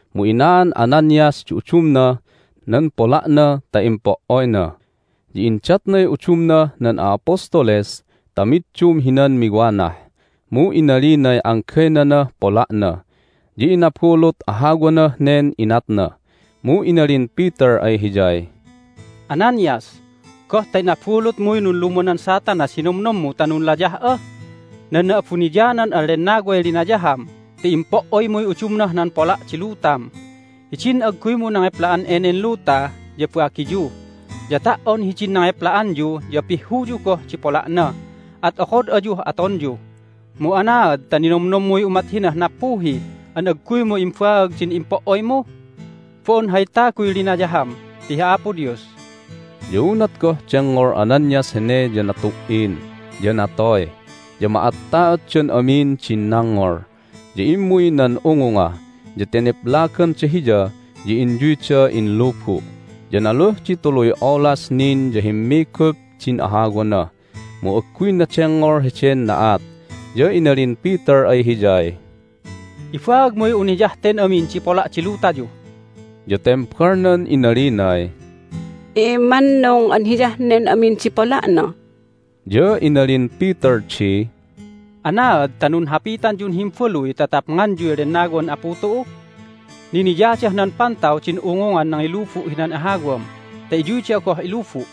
Mu inaan Ananias di udumnah nan pola'na ta impo"oyna, ya indatnay udumnah nan a'apostoles ta middum hinan miwanah. Mu inalinay anggaynanah pola'na, ya inabulut ahawanah nen inatna. Mu inalin Peter ay hiyay, "Ananias, goh ta inabulutmuy nunlumanan Satanas hi nomnommu ta nunlayah'a? Nan Na'abuniyanan an Lennaway linayaham ti impo"oymuy udumnah nan pola' di lutam! Hidin agguymu nangepla'an enen luta ya bagiyu, ya ta"on hidin nangepla'anyu ya pihhuyu goh di pola'na, at okod ayuh atonyu. Mu anaad ta ninomnommuy umat hinah nappuhi an agguymu imbaag din impo"oymu? Bo'on hay taguy linayaham, ti hi Apo Dios!" Ya unat goh dengngol Ananias hene ya natu"in, ya natoy. Ya ma'atta'otdan amin din nangngol. Ya immuy nan ungunga, ya teneplaganda hiya, ya inyuyda inlubu'. Ya naluh di tuluy olas nin ya himmigup din ahawana, mu agguyna dengngol heden na'at. Ya inalin Peter ay hiyay, "Ibaagmuy un hiyah ten amin di pola' di lutayu." Ya tembalnan inalinay, "Immannung an hiyah nen amin di pola'na." Ya inalin Peter di, "Anaad ta nunhapitanyun himbaluy ta tapnganyuy Lennawan Apu tu'u? Niniyadah nan pantaw din ungungan nangilubu' hinan ahawam ta iyuy da'a goh ilubu'!"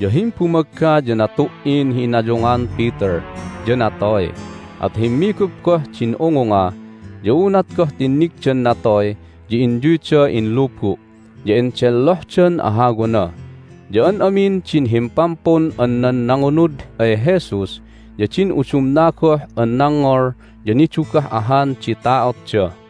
Ya himbumagga ya natu"in hi inayungan Peter, ya natoy. At himmigup goh din ungunga, ya unat goh tinnigdan natoy ya inyuyda inlubu', ya endellohdan ahawana. Ya an amin din himpampun an nan nangunud ay Jesus ya din udumna goh an nangngol ya nidugah ahan di ta'otda.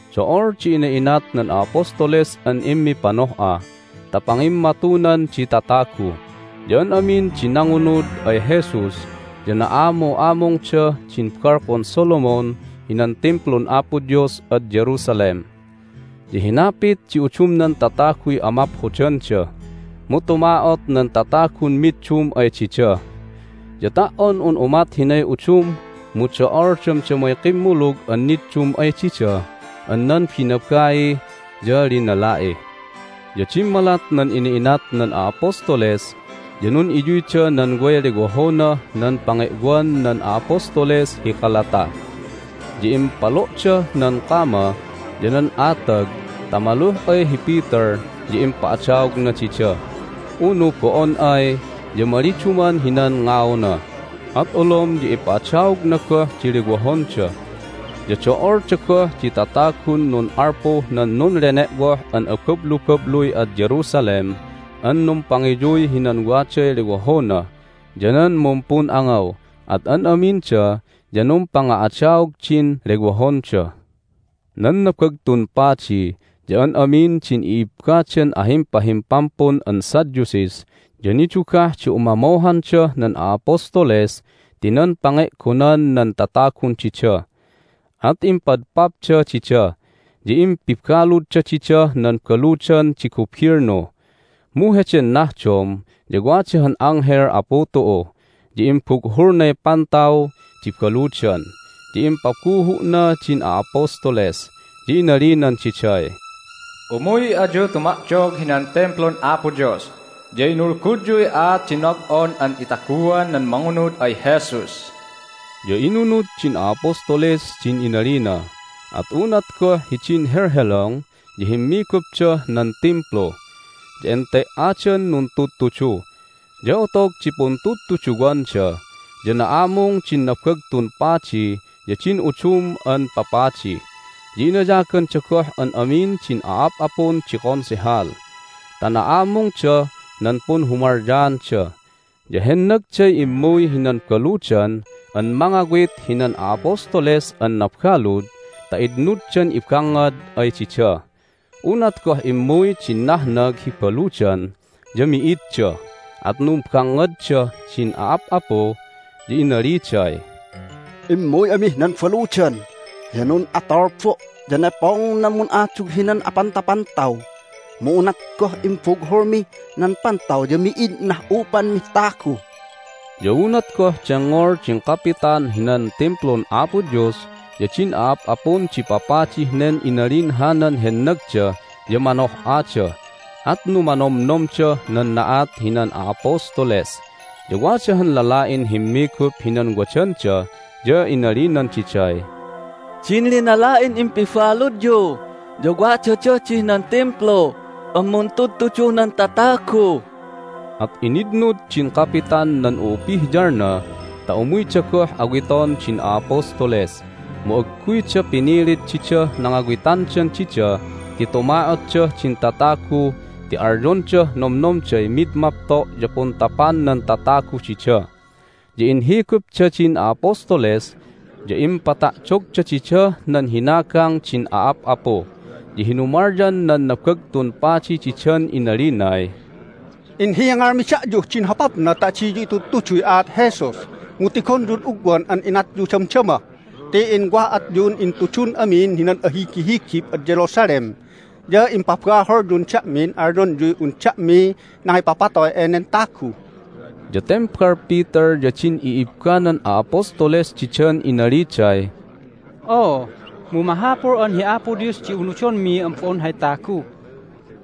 Do'ol di ina'inat nan a'apostoles an immipanoh'a ta pangimmatunan di tatagu. Ya an amin di nangunud ay Jesus ya na'amu'amungdah din Balkon Solomon hinan Timplun Apo Dios ad Jerusalem. Ya hinapit di udumnan tataguy amaphodanda, mu tuma'ot nan tatagun middum ay dida. Ya ta"on un umat hinay udum mu do'ol damdamay kimmulug an niddum ay dida an nan binabai ya linala'i. Ya dimmalat nan ina'inat nan a'apostoles ya nun'iyuyda nan way lewohonah nan pange'wan nan a'apostoles hi kalata, ya impalo'dah nan kama ya nan atag ta maluh ay hi Peter ya impa'adaogna dida, unu bo'on ay ya maliduman hinan ngauna, at olom ya ipa'adaogna goh di lewohonda. Ya do'olda goh di tatagun nun'alpuh nan nunlene'woh an abablubabluy ad Jerusalem an numpangiyuy hinan waday lewohona ya nan mumpun'angaw, at an aminda ya numpanga'adaog din lewohonda. Nan Nabagtun Padi ya an amin din i'ibbadan ahimpahimpampun an Sadducees ya nidugah di umamohandah nan a'apostoles ti nan pange'gonan nan tatagun dida. At impadpapda dida, ya impibaludda didah nan baludan di gubilnu. Mu heden nahdom ya wada han anghel Apu tu'u, ya imbughulnay pantaw di baludan, ya impabuhu'na din a'apostoles, ya inalinan diday, "Umuy ayu tuma'dog hinan Timplun Apo Dios, ya inulgudyuy aat di nob'on an itaguan nan mangunud ay Jesus." Ya inunud din a'apostoles din inalina. At unat goh hidin helhelong ya himmigupdah nan Timplu, ya ente"adan nuntudtudu. Ya otog di puntudtuduwanda ya na'amung din Nabagtun Padi ya din udum an papadi, ya inayaganda goh an amin din a'ap'apun di Konsehal ta na'amungdah nan punhumalyaanda. Ya hennagday immuy hinan baludan an mangawit hinan a'apostoles an nabalud ta itnuddan ibangngad ay dida. Unat goh immuy din nahnag hi baludan ya mi'idda! At numbangngaddah din a'ap'apu, ya inaliday, "Immuy amih nan baludan, ya nun'atulbo', ya nepong nan mun'adug hinan apantapantaw! Mu unat goh imbughulmi nan pantaw ya mi'id inah'upanmih tagu!" Ya unat goh dengngol din kapitan hinan Timplun Apo Dios ya din a'ap'apun di papadih nen inalin hanan hennagda ya manoh'ada, at numanomnomdah nan na'at hinan a'apostoles. Ya wada han lala'in himmigup hinan wadanda, ya inalinan diday, "Din linala'in impibaludyu ya wadadah dih nan Timplu an muntudtuduh nan tatagu!" At initnud din kapitan nan u'upihyalna ta umuyda goh awiton din a'apostoles. Mu agguyda pinilit didah nangawitandan dida ti tuma'otdah din tatagu ti alyondah nomnomday mid mapto' ya puntapan nan tatagu dida. Ya inhigupda din a'apostoles, ya impata'dogda didah nan hinagang din a'ap'apu. Ya hinumalyan nan Nabagtun Padi didan inalinay, "Inhingalmi da'yuh din hopapna ta adiyu itudtuduy aat Jesus, mu tigonyud ugwan an inatyu damdama! Ti inwa'atyun intudun amin hinan ahigihigib ad Jerusalem, ya impabaholyun da'min alyonyuy un da'miy nangipapatoy enen tagu!" Ya tembal Peter ya din i'ibbanan a'apostoles didan inaliday, "Oo, mu mahapul an hi Apo Dios di unudonmi an bo'on hay tagu!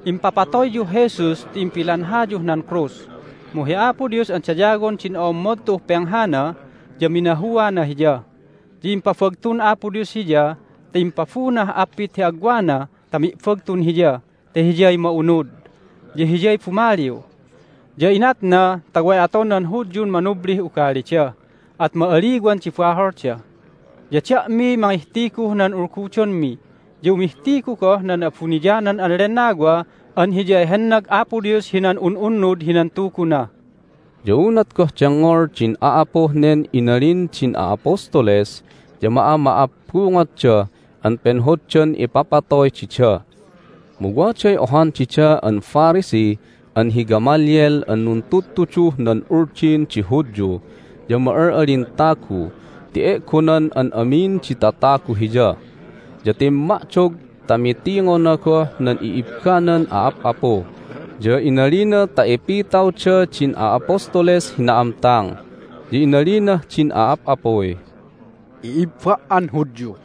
Impapatoyyuh Jesus ti impilanhayuh nan krus, mu hi Apo Dios an dayawon din o'ommod tu'uh penghana ya minahuana Hiya. Ya impabagtun Apo Dios Hiya ta impabunah appit hi agwana ta mi'bagtun Hiya ta Hiyay ma'unud, ya Hiyay bumaliw. Ya inatna ta way aton nan Hudyun manublih ugalida, at ma'aliwan di baholda. Ya da'miy mangihtiguh nan ulgudonmi, ya umihtigu goh nan Na'abuniyanan an Lennawa an Hiyay hennag Apo Dios hinan un'unnud hinan tuguna." Ya unat goh dengngol din a'apuh nen inalin din a'apostoles ya ma'ama'abbungotda an penhoddan papatoy dida. Mu waday ohan dida an Pharisee an hi Gamaliel an nuntudtuduh nan Uldin di Hudyu, ya ma'al'alin tagu ti e'gonan an amin di tatagu hiya. Ya timma'dog ta mitingona goh nan i'ibbanan a'ap'apu, ya inalina ta ipitawda din a'apostoles hi na'amtang. Ya inalinah din a'ap'apuy, "I'ibba' an Hudyu,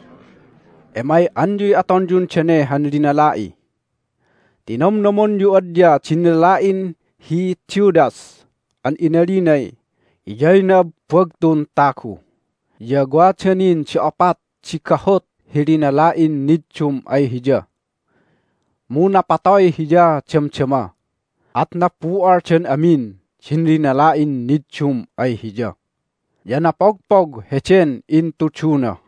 emay'anyuy atonyun dane han linala'i! Ti nomnomonyu adya din lala'in hi Theudas an inalinay hiyay na'abbagtun tagu, ya wada nin di opat di gahut hi linala'in niddum ay hiya. Mu napatoy hiya damdama, at nabu'aldan amin din linala'in niddum ay hiya, ya napogpog heden intuduna.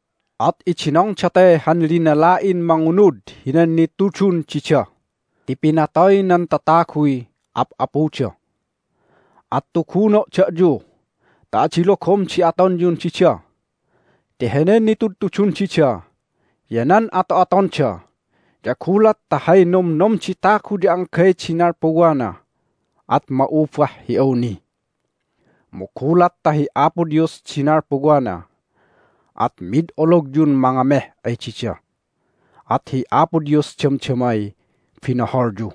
At idinong date han linala'in mangunud hinan nitudun dida ti pinatoy nan tataguy ap'apuda. At tuguno' da'yu ta adi logom di atonyun dida ti henen nitudtudun dida ya nan ato'atonda ya gulat ta hay nomnom di tagu ya anggay di nalpuwana at ma'ubah hi awni. Mu gulat ta hi Apo Dios di nalpuwana at mid ologyun mangameh ay dida, at hi Apo Dios damdamay binoholyu."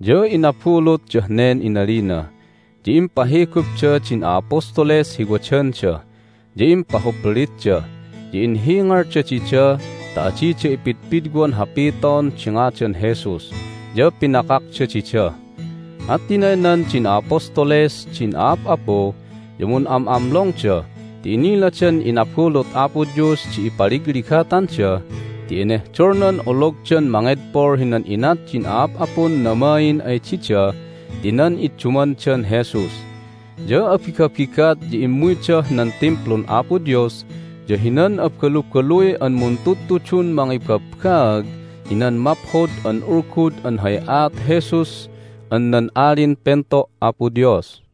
Ya inabulutdah nen inalina. Ya impahigupda din a'apostoles hi wadanda, ya impahuplitda, ya inhingalda dida ta adida ipidpidwan hapiton di ngadan Jesus, ya pinakakda dida. At tinaynan din a'apostoles din a'ap'apu, ya mun'am'amlongda ti iniladan inabulut Apo Dios di ipaligligatanda ti enehdolnan ologdan mangedpol hinan inat din a'ap'apun namain ay dida ti nan iddumandan Jesus. Ya abigabigat ya immuydah nan Timplun Apo Dios ya hinan abalubaluy an muntudtudun mangibabbaag hinan Maphod an Ulgud an hay aat Jesus an nan Alin Pento' Apo Dios.